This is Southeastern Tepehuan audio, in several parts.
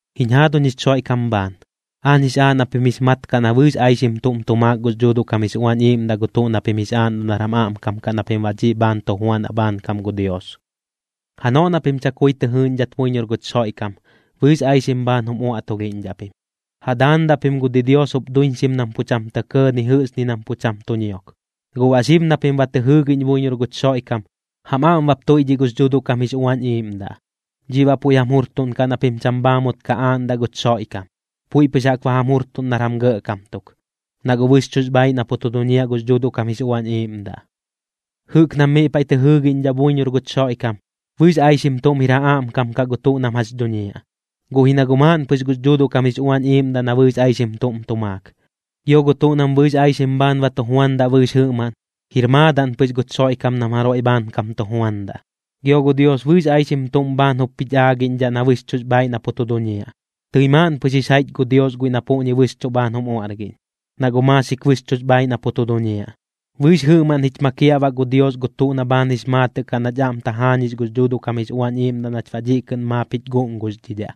Jiñ jaaduñ jich Xoiꞌkam bhaan, aañ jix aaꞌ na pim jix mat kaꞌ na bɨɨx aixim tuꞌm tu maak gux Dhuuduꞌ kam jix Uañ Iiꞌmdaꞌ gu tuꞌ na pim jix aaꞌndaꞌ nar jam aꞌmkam kaꞌ na pim baꞌ dhiꞌ bhaan tu juanaꞌ bhaankam gu Dios. Janoꞌ na pim chakui tɨ jɨɨꞌñdhat buiñor guch Xoiꞌkam, bɨɨx aixim bhaan jum uaꞌtulhiꞌñdhaꞌ pim, ja daandaꞌ pim gu didios jup duiñxim nam pu cham tɇ kɇɇ ni jɨꞌx ni nam pu cham tu ñiok. Guꞌ baꞌ xib na pim ba tɨ jɨɨgiꞌñ buiñor guch Xoiꞌkam, jam aꞌm bap tuiꞌdhiꞌ gux Dhuuduꞌ kam jix Uañ Iiꞌmdaꞌ. Dhiꞌ baꞌ puiꞌ jam jurtuꞌnkaꞌ na pim cham bhaamut ka aaꞌndaꞌ guch Xoiꞌkam, puiꞌ pɨx jaꞌk ba jam jurtuꞌn nar jam gɇꞌkam tuk, na guꞌ bɨxchuꞌx bhaaiꞌ na pu tu duñiaꞌ gux Dhuuduꞌ kam jix Uañ Iiꞌmdaꞌ. Jɨꞌk nam miꞌ paiꞌ tɨ jɨɨgiꞌñdhaꞌ buiñor guch Xoiꞌkam, bɨɨx aixim tuꞌm jir ja aꞌmkam kaꞌ gu tuꞌ nam jax dhuñiaꞌ, guꞌ ji na guꞌ maaꞌn pɨx gux Dhuuduꞌ kam jix Uañ Iiꞌmdaꞌ na bɨɨx aixim tuꞌm tu maak. Gio gu tuꞌ nam bɨɨx aixim bhaan ba tu juandaꞌ bɨɨx jɨꞌmaꞌn, jir maadaꞌn pɨx guch Xoiꞌkam nam jaroiꞌ bhaankam tu juandaꞌ. Gio gu Dios bɨɨx aixim tuꞌm bhaan jup jich aagiꞌñdhaꞌ na bɨxchuꞌx bhaaiꞌ na pu tu duñiaꞌ, tɨi maaꞌn pɨx jix jaiꞌch gu Dios guiꞌ na puꞌñi bɨxchuꞌ bhaan jum uaꞌrgiꞌñ, na guꞌ maaxik bɨxchuꞌx bhaaiꞌ na pu tu duñiaꞌ. Bɨɨx jɨꞌmaꞌn jich makiaꞌ baꞌ gu Dios gu tuꞌ na bhaan jix maatɨꞌ kaꞌ nach aꞌm tajaañix gux Dhuuduꞌ kam jix Uañ Iiꞌmdaꞌ nach baꞌ dhiꞌ kɨꞌn maap jich guꞌnguxdhidhaꞌ.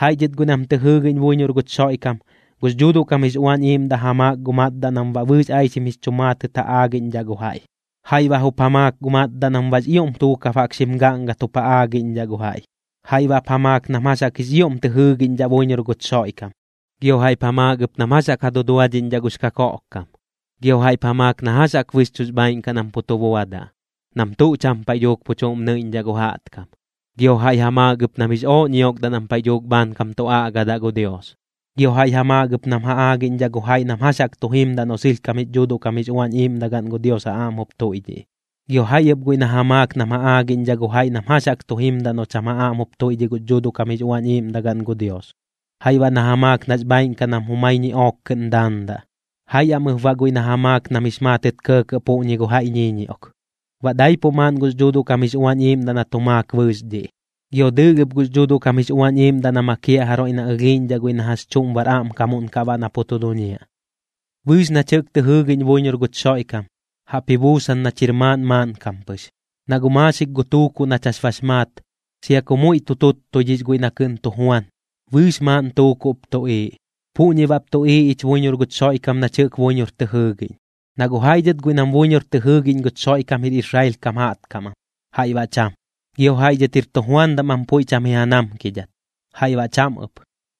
Jaiꞌ dhɨt guiꞌ nam tɨ jɨɨgiꞌñ buiñor guch Xoiꞌkam, gux Dhuuduꞌ kam jix Uañ Iiꞌmdaꞌ ja maak gu matdaꞌ nam baꞌ bɨɨx aixim jix chu maatɨt ja aagiꞌñdhaꞌ gu jaiꞌ, jaiꞌ baꞌ jup ja maak gu matdaꞌ nam baꞌx ioꞌm tuukab jaꞌk xim gaꞌngat jup ja aagiꞌñdhaꞌ gu jaiꞌ. Jaiꞌ baꞌp ja maak nam jax jaꞌk jix ioꞌm tɨ jɨɨgiꞌñdhaꞌ buiñor guch Xoiꞌkam, gio jaiꞌp ja maak ɨp nam jax jaꞌk ja duduadhiꞌñdhaꞌ gux kakoꞌkkam. Gio jaiꞌp ja maak na jax jaꞌk bɨxchuꞌx bhaaiꞌn kaꞌ nam pu tu buadaꞌ nam tuꞌ cham paiꞌ dhuuk pu chuꞌm nɨiꞌñdhaꞌ gu jaꞌtkam, gio jaiꞌ ja maak ɨp nam jix ooꞌ ñiokdaꞌ nam paiꞌ dhuuk bhaankam tu aꞌgadaꞌ gu Dios. Gio jaiꞌ ja maak ɨp nam ja aagiꞌñdhaꞌ gu jaiꞌ nam jax jaꞌk tu jimdaꞌ noꞌ sɨlhkam jix Dhuuduꞌ kam jix Uañ Iiꞌmdagaꞌn gu Dios ja aꞌm jup tuiꞌdhiꞌ, gio jaiꞌ ɨp guiꞌ na ja maak nam ja aagiꞌñdhaꞌ gu jaiꞌ nam jax jaꞌk tu jimdaꞌ noꞌ cham ja aꞌm jup tuiꞌdhiꞌ gux Dhuuduꞌ kam jix Uañ Iiꞌmdagaꞌn gu Dios. Jaiꞌ baꞌ na ja maak nax bhaaiꞌn kaꞌ nam jumai ñiꞌook kɨꞌn daandaꞌ, jaiꞌ am ɨp baꞌ guiꞌ na ja maak nam jix maatɨt kɇɇkɇꞌ puꞌñi gu jaiꞌ ñiiñioꞌk. Baꞌ daipuꞌ maaꞌn gux Dhuuduꞌ kam jix Uañ Iiꞌmdaꞌ na tu maak bɨɨx dhiꞌ, gio dɨɨlh ɨp gux Dhuuduꞌ kam jix Uañ Iiꞌmdaꞌ na makiaꞌ jaroiꞌ na ɨlhiiꞌñdhaꞌ guiꞌ na jax chuꞌm bar aꞌmkamuꞌn kaꞌ baꞌ na pu tu duñiaꞌ. Bɨɨx nach jɨꞌk tɨ jɨɨgiꞌñ buiñor guch Xoiꞌkam, jaꞌp ji buusan nach jir maaꞌn maaꞌnkam pɨx. Na guꞌ maaxik gu tuukuꞌ nach jax bax maat, sia ku muiꞌ tu tuttuidhix guiꞌ na kɨꞌn tu juan, bɨɨx maaꞌn tuukuꞌp tuꞌiiꞌ. Puꞌñi baꞌp tuꞌiiꞌ ich buiñor guch Xoiꞌkam nach jɨꞌk buiñor tɨ jɨɨgiꞌñ. Na guꞌ jaiꞌ dhɨt guiꞌ nam buiñor tɨ jɨɨgiꞌñ guch Xoiꞌkam jir Israel kam jaꞌtkam am, jaiꞌ baꞌ cham. Gio jaiꞌ dhɨt jir tujuandam am puiꞌ cham ji ja namkidhat, jaiꞌ baꞌ cham ɨp.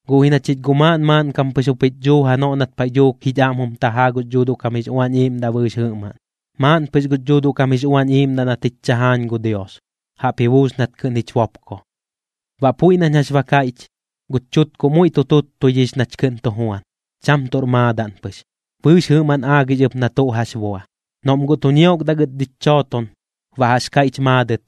Guꞌ ji na chich guꞌ maaꞌn maaꞌnkam pɨx jup jich dhuu janoꞌ nat paiꞌ dhuuk jich aꞌm jum tajaa gux Dhuuduꞌ kam jix Uañ Iiꞌmdaꞌ bɨɨx jɨꞌmaꞌn. Maaꞌn pɨx guꞌ gux Dhuuduꞌ kam jix Uañ Iiꞌmdaꞌ nat jich chajaañ gu Dios, jaꞌp ji buus nat kɨꞌn jich bopko. Baꞌ puiꞌ nañ jax ba kaiꞌch, guch chutkuꞌ muiꞌ tu tuttuidhix nach kɨꞌn tu juan, cham tuꞌr maadaꞌn pɨx. Bɨɨx jɨꞌmaꞌn aagix ɨp nam tuꞌ jax buadaꞌ. Noꞌm guꞌ tu ñiokdaꞌ gɨt dhich chooton, baꞌ jax kaiꞌch maadɨt: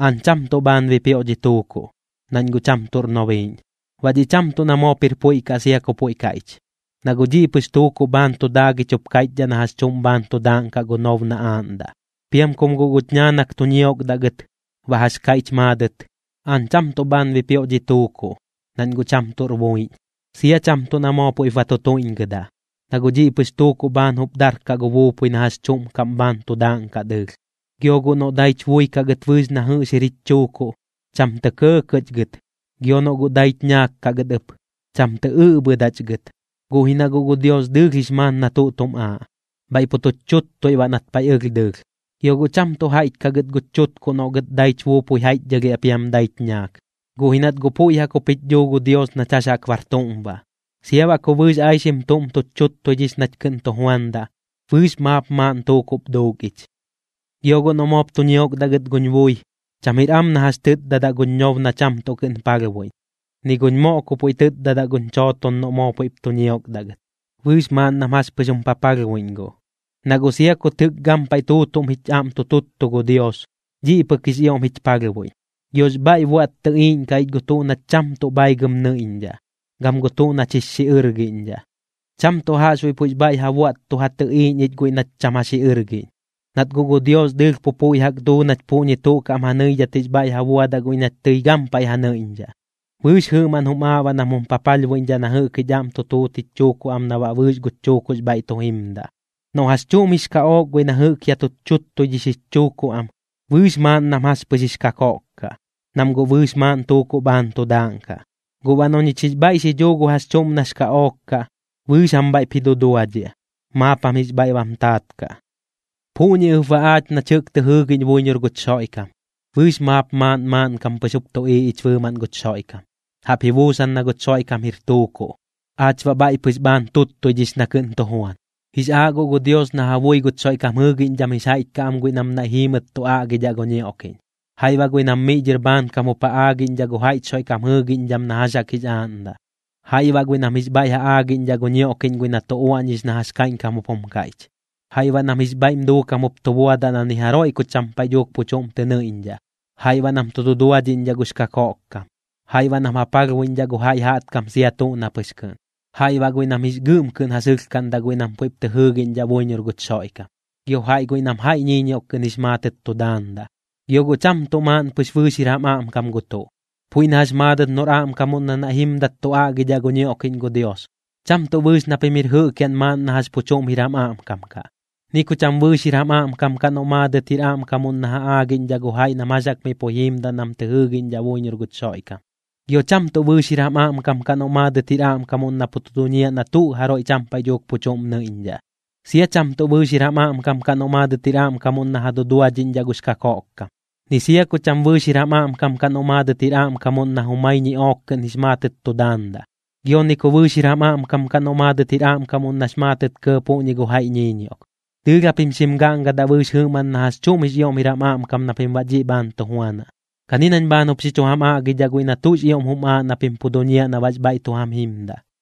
“Aañ cham tuꞌ bhaan bipioꞌ dhi tuukuꞌ, nañ guꞌ cham tuꞌr nobiiꞌñ.” Baꞌ dhiꞌ cham tuꞌ na moop jir puiꞌ kaꞌ sia ku puiꞌ kaiꞌch, na guꞌ dhiꞌ pɨx tuukuꞌ bhaan tu daagich jup kaiꞌchdhaꞌ na jax chuꞌm bhaan tu daaꞌnkaꞌ gu nob na aaꞌndaꞌ. Piam kum guꞌ guch ñaanak tu ñiokdaꞌ gɨt, baꞌ jax kaiꞌch maadɨt: “Aañ cham tuꞌ bhaan bipioꞌ dhi tuukuꞌ, nañ guꞌ cham tuꞌr buiꞌñ.” Sia cham tuꞌ na moo puiꞌp ba tu tuiꞌñgɨdaꞌ, na guꞌ dhiꞌ pɨx tuukuꞌ bhaan jup darkaꞌ gu buupui na jax chuꞌm kaꞌm bhaan tu daaꞌnkaꞌ dɨɨlh. Gio guꞌ noꞌ daich bui kaꞌ gɨt bɨɨx na jɨꞌx jir jich chuukuꞌ, cham tɇ kɇɇkɇꞌch gɨt. Gio noꞌ guꞌ daich ñaak kaꞌ gɨt ɨp, cham tɨ ɨꞌbhɨdaꞌch gɨt. Guꞌ ji na guꞌ gu Dios dɨɨlh jix maat na tuꞌ tum aaꞌ, bhaiꞌ pu tuch chuttui baꞌ nat paiꞌ ɨlh dɨɨlh. Gio guꞌ cham tuꞌ jaiꞌch kaꞌ gɨt guch chutkuꞌ noꞌ gɨt daich buupui jaiꞌchdhɨlhiaꞌ piam daich ñaak. Guꞌ ji nat guꞌ puiꞌ jaꞌk jup jich dhuu gu Dios nach jax jaꞌk bar tuꞌm baꞌ. Sia baꞌ ku bɨɨx aixim tuꞌm tuch chuttuidhix nach kɨꞌn tu juandaꞌ, bɨɨx maap maaꞌn tuukuꞌp duuk ich. Gio guꞌ noꞌ moop tu ñiokdaꞌ gɨt guñ bui, cham jir am na jax chɨtdadaꞌ guñ ñob na cham tuꞌ kɨꞌn palhbuiꞌñ, ni guñ moꞌ ku puiꞌ tɨtdadaꞌ guñ chooton noꞌ moo puiꞌp tu ñiokdaꞌ gɨt, bɨɨx maaꞌn nam jax pɨx jum papalhbuiꞌñ guꞌ. Na guꞌ sia kut jɨꞌk gampaiꞌ tuutuꞌm jich aꞌm tu tuttu gu Dios, dhiꞌ pɨk jix ioꞌm jich palhbuiꞌñ. Giox bhaiꞌ buaꞌt tɨꞌiiꞌñkaꞌ ich gu tuꞌ nach cham tuꞌ bhaigɨm nɨiꞌñdhaꞌ, gam gu tuꞌ nach jix xiꞌɨrgiꞌñdhaꞌ. Cham tuꞌ jaꞌxbuiꞌ puiꞌx bhaiꞌ ja buaꞌt tu ja tɨꞌiiꞌñ ich guiꞌ nach cham ja xiꞌɨrgiꞌñ, nat guꞌ gu Dios dɨɨlh pu puiꞌ jaꞌk duu nach puꞌñi tuꞌ kaꞌm ja nɨidhat jix bhaiꞌ ja buadaꞌ guiꞌ nach tɨi gampaiꞌ ja nɨiꞌñdhaꞌ. Bɨɨx jɨꞌmaꞌn jum aaꞌ baꞌ nam jum papalhbuiꞌñdhaꞌ na jɨꞌk jich aꞌm tu tuut jich chuukuꞌ am na baꞌ bɨɨx guch chuukuꞌx bhaiꞌ tu jimdaꞌ. Noꞌ jax chuꞌm jix kaꞌook guiꞌ na jɨꞌk ya tuch chuttuidhix jich chuukuꞌ am, bɨɨx maaꞌn nam jax pɨx jix kakoꞌk kaꞌ, nam guꞌ bɨɨx maaꞌn tuukuꞌ bhaan tu daaꞌnkaꞌ. Guꞌ baꞌ noꞌ ñich jix bhaiꞌ xi dhuu gu jax chuꞌm nax kaꞌook kaꞌ, bɨɨx jam bhaiꞌp ji duduadhiaꞌ, maap jam jix bhaiꞌ bam taat kaꞌ. Puꞌñi ɨp baꞌ aach nach jɨꞌk tɨ jɨɨgiꞌñ buiñor guch Xoiꞌkam, bɨɨx maap maaꞌn maaꞌnkam pɨx jup tuꞌiiꞌ ich bɨɨmaꞌn guch Xoiꞌkam, jaꞌp ji buusan na guch Xoiꞌkam jir tuukuꞌ, aach baꞌ bhaiꞌ pɨx bhaan tuttuidhix na kɨꞌn tu juan. Jix aaꞌ guꞌ gu Dios na ja bui guch Xoiꞌkam jɨɨgiꞌñdham jix jaiꞌch kaꞌ am guiꞌ nam naiꞌ jiimɨt tu aꞌgidhaꞌ gu ñioꞌkiꞌñ, jaiꞌ baꞌ guiꞌ nam miꞌ dhɨr bhaankam jup ja aagiꞌñdhaꞌ gu jaiꞌch Xoiꞌkam jɨɨgiꞌñdham na jax jaꞌk jix aaꞌndaꞌ, jaiꞌ baꞌ guiꞌ nam jix bhaiꞌ ja aꞌgiꞌñdhaꞌ gu ñioꞌkiꞌñ guiꞌ na tu uaꞌñix na jax kaiꞌñkam jup jum kaiꞌch, jaiꞌ baꞌ nam jix bhaiꞌm duukam jup tu buadaꞌ na ni jaroiꞌ ku cham paiꞌ dhuuk pu chuꞌm tɨ nɨiꞌñdhaꞌ, jaiꞌ baꞌ nam tu duduadhiꞌñdhaꞌ gux kakoꞌkkam, jaiꞌ baꞌ nam ja palhbuiꞌñdhaꞌ gu jaiꞌ jaꞌtkam sia tuꞌ na pɨx kɨꞌn, jaiꞌ baꞌ guiꞌ nam jix gɨꞌm kɨꞌn ja sɨlhkaꞌndaꞌ guiꞌ nam puiꞌp tɨ jɨɨgiꞌñdhaꞌ buiñor guch Xoiꞌkam, gio jaiꞌ guiꞌ nam jaiꞌ ñiiñioꞌk kɨꞌn jix maatɨt tu daandaꞌ. Gio guꞌ cham tuꞌ maaꞌn pix bɨɨx jir jam aꞌmkam gu tuꞌ, puiꞌ na jax maadɨt noꞌr aꞌmkamuꞌn na naiꞌ jimdat tu aꞌgidhaꞌ gu ñioꞌkiꞌñ gu Dios, cham tuꞌ bɨɨx na pim jir jɨꞌkiaꞌn maaꞌn na jax pu chuꞌm jir jam aꞌmkam kaꞌ. Ni ku cham bɨɨx jir jam aꞌmkam kaꞌ noꞌ maadɨt jir aꞌmkamuꞌn na ja aagiꞌñdhaꞌ gu jaiꞌ nam jax jaꞌk miꞌ puiꞌ jiimdaꞌ nam tɨ jɨɨgiꞌñdhaꞌ buiñor guch Xoiꞌkam. Gio cham tuꞌ bɨɨx jir jam aꞌmkam kaꞌ noꞌ maadɨt jir aꞌmkamuꞌn na pu tu duñiaꞌ na tuꞌ jaroiꞌ cham paiꞌ dhuuk pu chuꞌm nɨiꞌñdhaꞌ. Sia cham tuꞌ bɨɨx jir jam aꞌmkam kaꞌ noꞌ maadɨt jir aꞌmkamuꞌn na ja duduadhiꞌñdhaꞌ gux kakoꞌkkam, ni sia ku cham bɨɨx jir jam aꞌmkam kaꞌ noꞌ maadɨt jir aꞌmkamuꞌn na jumai ñiꞌook kɨꞌn jix maatɨt tu daandaꞌ, gio ni ku bɨɨx jir jam aꞌmkam kaꞌ noꞌ maadɨt jir aꞌmkamuꞌn nax maatɨt kɇɇ puꞌñi gu jaiꞌ ñiiñioꞌk. Dɨɨlh japim xim gaꞌngadaꞌ bɨɨx jɨꞌmaꞌn na jax chuꞌm jix ioꞌm jir jam aꞌmkam na pim baꞌ dhiꞌ bhaan tu juanaꞌ. Kani nañ bhaan jup xi chu jam aꞌgidhaꞌ guiꞌ na tuꞌx ioꞌm jum aaꞌ na pim pu duñiaꞌ na baꞌx bhaiꞌ tu jam jimdaꞌ.